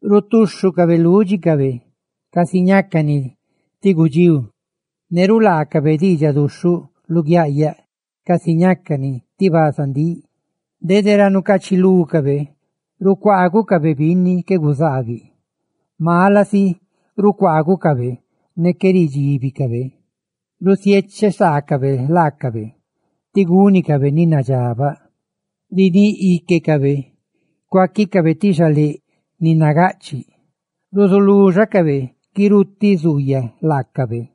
rutúxhucabe lúdxicabe casi ñácani ti gudxíu, ne rulaacabe diidxaduxhuꞌ luguiaꞌyaꞌ casi ñácani ti bazandíꞌ. Dede ra nucaachilúcabe rucuaagucabe binni qué guzaabiꞌ; mala si rucuaagucabe ne qué ridxíbidicabe. Rusiecheꞌ saacabe laacabe ti gúnicabe ni nadxabaꞌ; riníꞌ íquecabe cuaquicabe ti xaléꞌ ni nagaꞌchiꞌ, ruzuluxacabe guirutiꞌ zuuyaꞌ laacabe,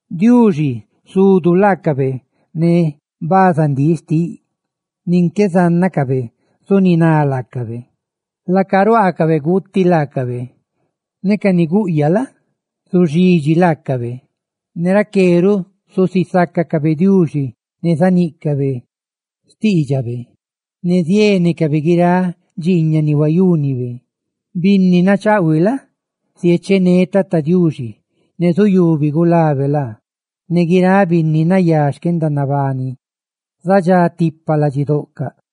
Diuxi zudu laacabe ne bazandíꞌ xtiꞌ, nin qué zánnacabe zuniná laacabe; laaca ruaacabe guuti laacabe, ne ca ni guꞌyaꞌ la? zuxidxi laacabe. Ne raqué ruꞌ zusisácacabe Diuxi, ne zaníꞌcabe guiráꞌ ni bíꞌnibe; ne ziénecabe guiráꞌ dxiiñaꞌ ni huayúnibe. Binni nachaꞌhuiꞌ la? ziechené Tata Diuxi, ne zuyubi gulabe laa, ne guiráꞌ binni nayá xquendanabaniꞌ zadxá tipa ladxidoꞌcaꞌ.